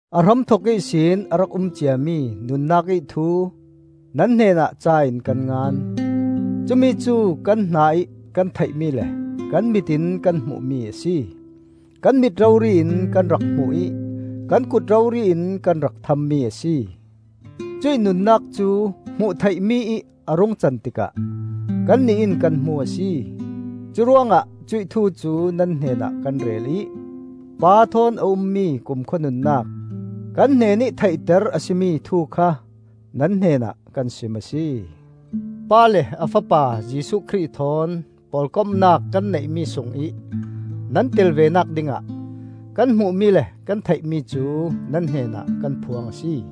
A hramthok ihsin a rak um ciami nunnak ih Thu nan hnenah ca in kan ngan. Cumi cu kan hna ih kan theihmi le kan mit in kan hmuhmi a si. Kan mit rori in kan rak hmuh ih kan kut rori in kan rak thammi a si. Cuih nunnak cu hmuh theihmi ih a rung can tikah kannih in kan hmu a si. Curuangah cuih Thu cu nan hnenah kan rel ih Pa thawn a ummi kumkhua nunnak, kan hnenih theihter a si mi Thu kha nan hnenah kan sim a si. Pa le a fapa Jesuh Khrih thawn pawlkomnak kan neihmi sungih nan tel venak dingah kan hmuhmi le kan theihmi cu nan hnenah kan phuang a si.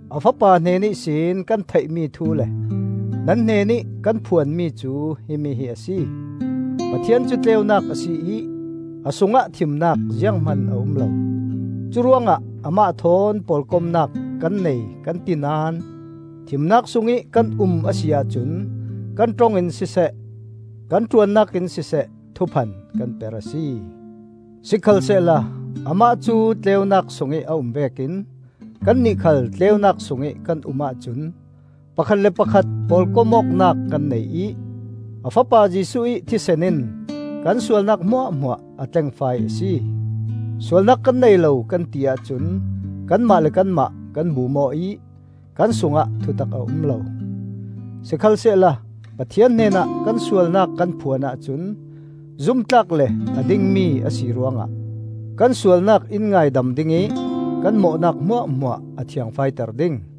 A Fapa hnen ihsin kan theihmi thu le nan hnenih kan phuanmi cu himi hi a si: Pathian cu tleunak a si ih a sungah thimnak zianghman a um lo. Curuangah amah thawn pawlkomnak kan nei kan ti naón thimnak sungih kan um a si ahcun kan ṭong in siseh, kan ṭuannak in siseh, thuphan kan per a si. Sikhalsehla amah cu tleunak sungih a um vekin kannih khal tleunak sungih kan um ahcun pakhat le pakhat pawlkom awknak kan nei ih a Fapa Jesuh ih thisen in kan sualnak hmuahhmuah a tlengfai a si. Sualnak kan nei lo kan ti ahcun kanmah le kanmah kan bum aw ih kan sungah thutak a um lo. Sikhalsehla Pathian hnenah kan sualnak kan phuan ahcun zumtlak le a dingmi a si ruangah kan sualnak in ngaidam ding ih kan mawhnak hmuahhmuah a thiangfaiter ding.